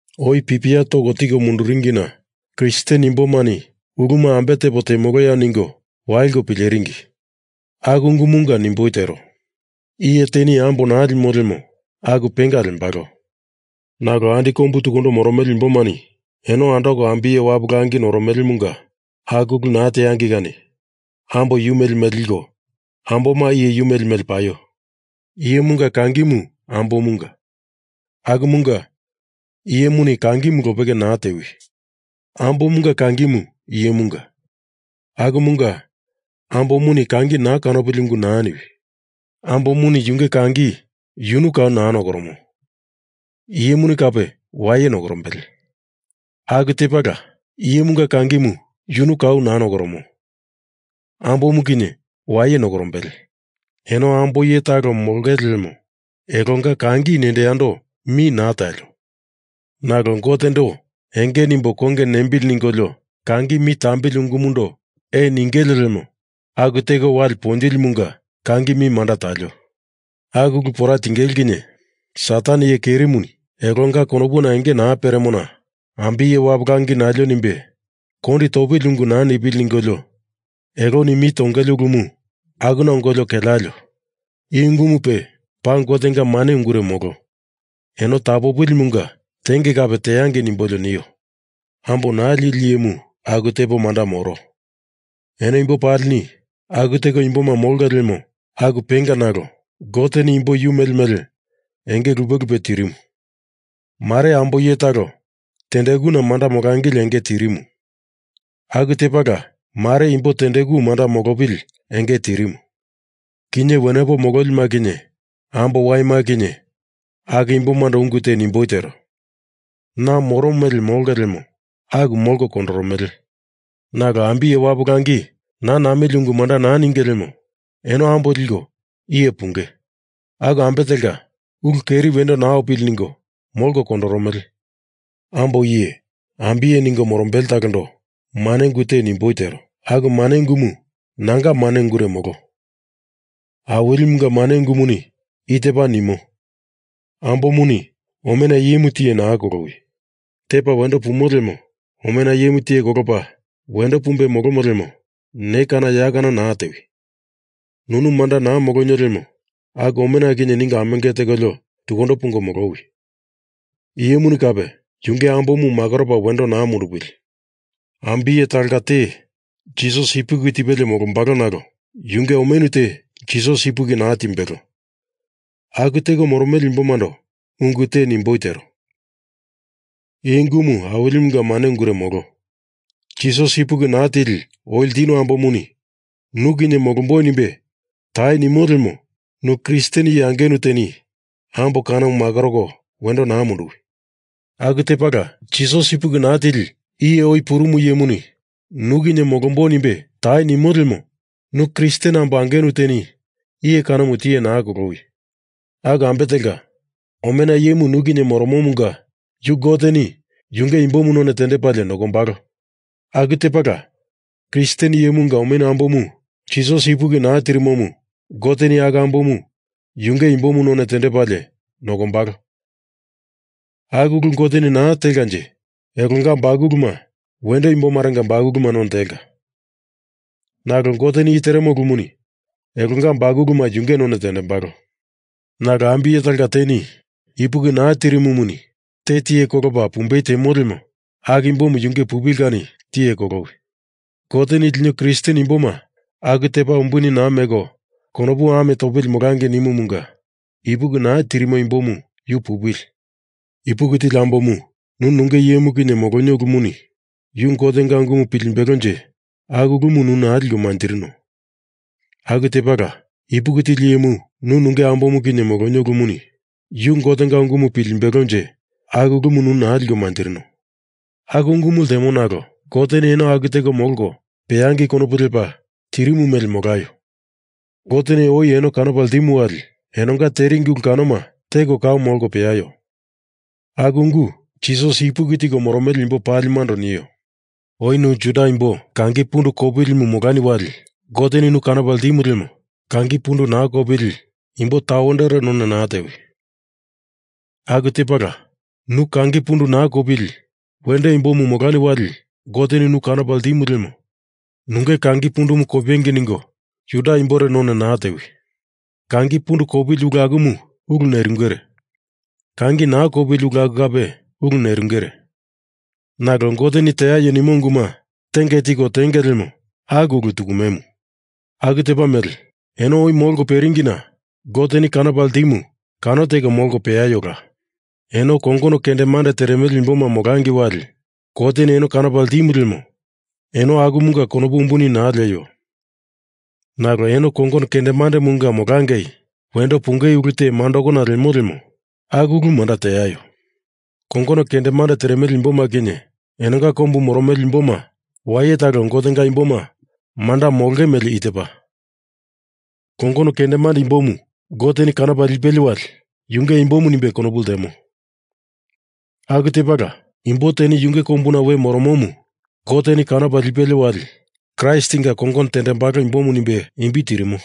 Oi pipia toko tiko munduringina Kristen imbomani uluma ambe tepo temoloya ningo waliko pileringi. Aku ungumunga nimboi tero. Iye teni ambo naa limo lemo aku penga lembalo. Nalo andi kombu tukundo moromele imbomani eno andoko ambiye wapu langi noromelemunga aku ulu naa teangei kani ambo yu mele mele liko amboma iye yu mele mele paio. Iyemunga kangimu ambomunga. Akumunga iyemuni kangimu lopeke naa tewi. Ambomunga kangimu iyemunga. Akumunga ambomuni kangi naa kanopili ungu naa niwi. Ambomuni yunge kangi yunu kau naa nokoromo. Iyemuni kape waye nokorombele. Aku tepala iyemunga kangimu yunu kau naa nokoromo. Ambomu kinye waye nokorombele. Eno ambo iye talo molongele lemo elonga kangi nendo yando mi naa talio. Nalo Gotendo enge nimbo konge nembili ningolio kangi mi tambili ungumundo ee ningele lemo aku teko wali ponjilimunga kangi mi manda talio. Aku ulu pora tingele kinye Satan iye kerimuni elonga konopuna enge naa peremona ambiye wapu langi nalio nimbe kondi topili ungu naa nipili ningolio eloni mi tongele ulumu akuna ongolio kelealio. I ungumu pe paa Gotenga mane ungure molo. Eno tapopilimunga tenge kape teangei nimbolio nio. Ambo naa lili iyemu aku tepo manda moro. Eno imbo palini aku teko imboma molonge lemo aku penga nalo Goteni imbo yu mele mele enge lupe lupe tirimu. Mare ambo iye talo tendekuna manda molangili enge te tirimu. Aku tepala mare imbo tendeku manda molopili enge te tirimu. Kinye wenepo mololima kinye ambo waima kinye aku imbomando ungu te nimboi tero. Na moro mele molongei lemo aku molko kondoromele. Nalo ambiye wapu langi naa namili ungu manda naa ninge lemo eno ambo liko iye punge. Aku ambe telka, ulu keri wendo naa opili ningo molko kondoromele. Ambo iye ambiye ningo morombele talondo mane ungu te nimboi tero. Aku mane ungumu nanga mane ungure molo. Awilimunga mane ungumuni i tepa nimo ambomuni omena iyemu tiye naa kolowi. Tepa wendo pumo lemo omena iyemu tiye kolopa wendo pumbe molomo lemo ne kana ya kana naa tewi. Nunu manda naa molonio lemo aku omena kinye ningo amenge tekolio tukundo pungo molowi. Iyemuni kape yunge ambomu makoropa wendo naa mundupili. Ambiye talonga te Jisas ipuki tipelie molombalo nalo yunge omenu te Jisas ipuki naa timbelo aku teko moromele imbomando ungu te nimboi tero. I ungumu Awilimunga mane ungure molo. Jisas ipuki naa tili oi ltinu ambomuni nu kinye molomboi nimbe tai nimo lemo nu Kristen iye angenu teni ambo kanomu makoroko wendo naa munduwi. Aku tepala, Jisas ipuki naa tili iye oi purunu iyemuni nu kinye molomboi nimbe tai nimo lemo nu Kristen ambo angenu teni iye kanomu tiye naa kolowi. Aku ambe telka omena iyemu nu kinye moromomunga yu Goteni yunge imbomu none tendepalie nokombalo. Aku tepala Kristen iyemunga omenu ambomu Jisas ipuki naa tirimomu Goteni aku ambomu yunge imbomu none tendepalie nokombalo. Aku ulu Goteni naa telkanje elonga bakuluma wendo imbomarenga bakuluma none telka. Nalo Goteni i teremo ulumuni elonga bakuluma yunge none tendembalo. Nalo ambiye talonga teni ipuki naa tirimumuni te tiye kolopa pumbei temo lemo aku imbomu yunge pupili kani tiye kolowi. Goteni lino Kristen imboma aku tepa umbuni naa meko konopu ame topili molangei nimumunga ipuki naa tirimo imbomu yu pupili. Ipuki tili ambomu nu nunge iyemu kinye molonio ulumuni yu Gotenga ungumu pilimbelonje aku ulumu nu naa liko manjirino. Aku tepala ipuki tili iyemu nu nunge ambomu kinye molonio ulumuni yu Gotenga ungumu pilimbelonje aku ulumu nu naa liko manjirino. Aku ungumu ltemo nalo Goteni eno aku teko molko peangei konopu lepa tirimu mele molaio. Goteni oi eno kanopa ltimu wali enonga teringi ulu kanoma teko kau molko peaio. Aku ungu Jisas ipuki tiko moromele imbo palimando nio. Oi nu Juda imbo kangi pundu kopilimu molani wali Goteni nu kanopa ltimu lemo kangi pundu naa kopili imbo tawendore none naa tewi. Aku tepala nu kangi pundu naa kopili wendo imbomu molani wali Goteni nu kanopo ltimu lemo nunge kangi pundumu kopengei ningo Juda imbore none naa tewi. Kangi pundu kopili ulu akumu ulu nerungere. Kangi naa kopili ulu aku kape ulu nerungere. Nalo Goteni teaio nimo unguma tenge tiko tenge lemo aku ulu tukumemu. Aku tepa mele eno oi molko peringina Goteni kanopa ltimu kano teko molko peaiola. Eno kongono kendemande teremele imboma molangei wali Goteni eno kanopa ltimu lemo eno akumunga konopu umbuni naa lieio. Nalo eno kongono kendemandemunga molangei wendo pungei ulu te mandakona lemo lemo aku ulu manda teaio. Kongono kendemande teremele imboma kinye enonga kombu moromele imboma waye talo Gotenga imboma manda molonge mele i tepa, Kongono kendemande imbomu Goteni kanopa lipelie wali yunge imbomu nimbe konopu ltemo. Aku tepala imbo teni yunge kombuna we moromomu Goteni kanopa lipelie wali Kraistinga kongono tendembalo imbomu nimbe imbi tirimo.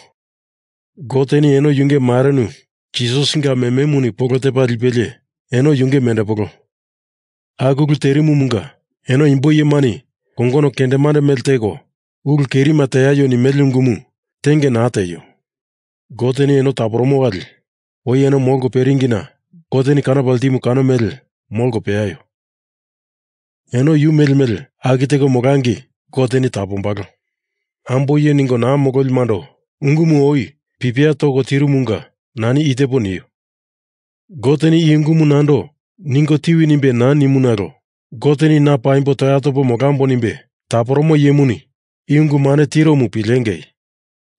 Goteni eno yunge marenu Jisasinga mememuni polo tepa lipelie eno yunge mendepolo. Aku ulu terimumunga eno imbo iyemani kongono kendemande mele teko ulu kerima teaio nimele ungumu tenge naa tieio. Goteni eno taporomo wali oi eno molko peringina Goteni kanopa ltimu kano mele molko peaio. Eno yu mele mele aku teko molangei Goteni tapombalo. Ambo iye ningo naa mololimando ungumu oi pipia toko tiringimunga nani i tepo nio. Goteni i ungumu nando ningo tiwi nimbe naa nimu nalo Goteni na paimbo toya topo molambo nimbe taporomo iyemuni i ungu mane tiromu pilengei.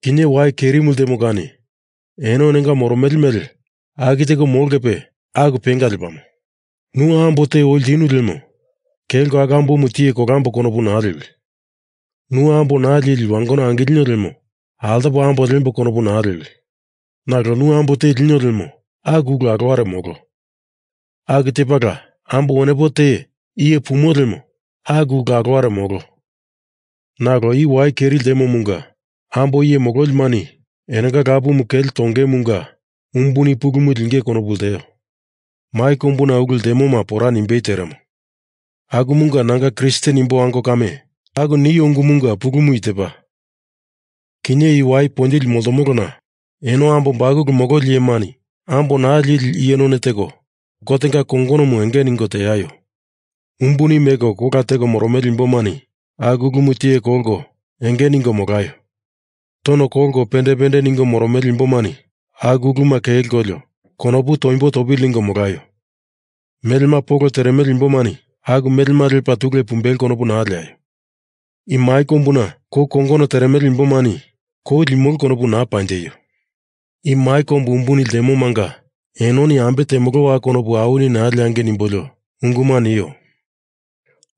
Kinye wai kerimu ltemo kani eno enonga moromele mele aku teko molongepe aku penga lepamo. Nu ambo te oi ltinu lemo kelko aku ambomu tiye kolamboi konopu naa lewi. Nu ambo naa lili wangono angilino lemo altopo ambo liemboi konopu naa lewi. Nalo nu ambo te linio lemo aku ulu aloware molo. Aku tepala ambo wenepo te iye pumo lemo aku ulu aloware molo. Nalo i wai keri ltemomunga ambo iye mololimani enonga lapumu kele tongeimunga umbuni pulumu lingei konopu lteo. Mai kombu ulu ltemoma pora nimbei teremo. Akumunga nanga Kristen imbo ango kame aku nio ungumunga pulumu i tepa. Kinye i wai ponjili moltomolona, eno ambo bakulu mololi iyemani ambo naa lili iye none teko Gotenga kongonomu enge ningo teaio. Umbuni meko kola teko moromele imbomani aku ulumu tiye kolko enge ningo molaio. Tono kolko pende pende ningo moromele imbomani aku uluma kelkolio konopu toimbo topili ningo molaio. Melema polo teremele imbomani aku melema lepa tule pumbelo konopu naa leaio. I mai kombuna kou kongono teremele imbomani kou limolo konopu naa panjeio. I mai kombu umbuni ltemomanga enoni ambe temolowa konopu awini naa leangei nimbolio unguma nio.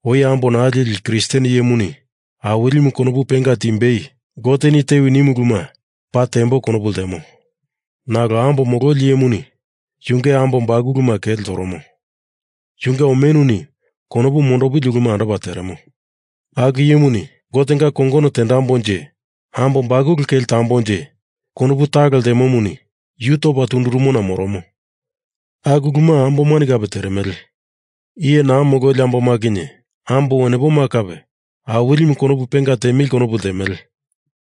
Oi ambo naa lili Kristen iyemuni Awilimu konopu penga timbei Goteni tewi nimu uluma paa tembo konopu ltemo. Nalo ambo mololi iyemuni yunge ambo bakuluma kele toromo. Yunge omenuni konopu mondopili uluma andopa teremo. Aku iyemuni Gotenga kongono tembonje ambo bakuluma kele tombonje konopu talo ltemomuni yu topa tundurumona moromo. Aku uluma ambomani kape teremele. Iye naa mololi amboma kinye ambo wenepoma kape Awilimu konopu penga tiemili konopu ltemele.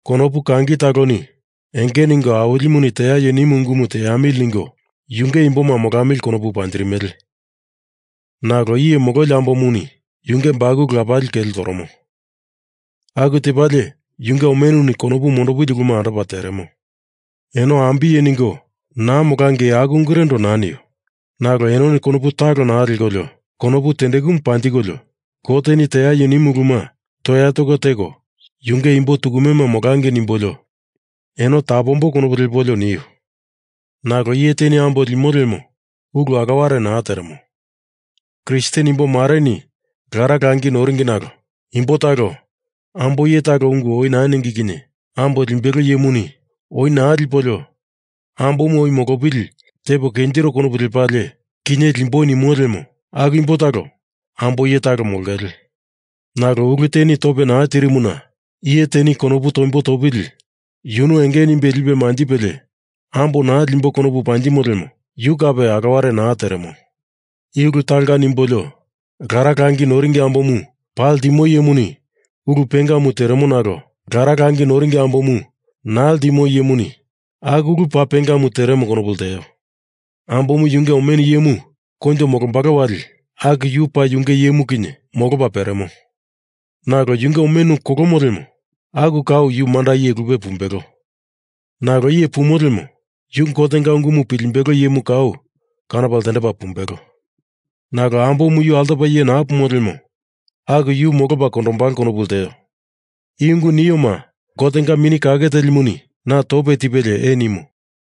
Konopu kangi taloni enge ningo Awilimuni teaio nimu ungumu teamili ningo yunge imboma molamili konopu panjirimele. Nalo iye mololi ambomuni yunge bakulu lapali kele toromo. Aku tepalie yunge omenuni konopu mondopili uluma andopa teremo. Eno ambiye ningo naa molangei aku ungurendo naa nio. Nalo enoni konopu talo naa lekolio konopu tendekumu panjikolio Goteni teaio nimu uluma toya toko yunge imbo tukumema molangei nimbolio eno tapomboi konopu lepolio nio. Nalo iye teni ambo limo lemo ulu aloware naa teremo. Kristen imbo mareni lara langi noringi nalo imbo talo ambo iye talo ungu oi naa ningi kinye ambo limbelo iyemuni oi naa lipolio ambomu oi molopili tepo kenjiro konopu lepalie, kinye limboi nimo lemo aku imbo talo ambo iye talo molongele. Nalo ulu teni tope naa tirimuna iye teni konopu toimbo topili yunu enge nimbe lipe manjipelie ambo naa limbo konopu panjimo lemo yu kape aloware naa teremo. I ulu talonga nimbolio lara langi noringi ambomu paa ltimo iyemuni ulu pengamu teremo nalo lara langi noringi ambomu naa ltimo iyemuni aku ulu paa pengamu teremo konopu lteo. Ambomu yunge omenu iyemu koinjo molombalo wali aku yu paa yunge iyemu kinye molopa peremo. Nalo yunge omenu kolomo lemo aku kau yu manda iye lupe pumbelo. Nalo iye pumo lemo yu Gotenga ungumu pilimbelo iyemu kau kanopa ltendepa pumbelo. Nalo ambomu yu altopa iye naa pumo lemo aku yu molopa kondombalo konopu lteo. I ungu nioma Gotenga Mini Kake Telimuni na tope tipelie ee nimo.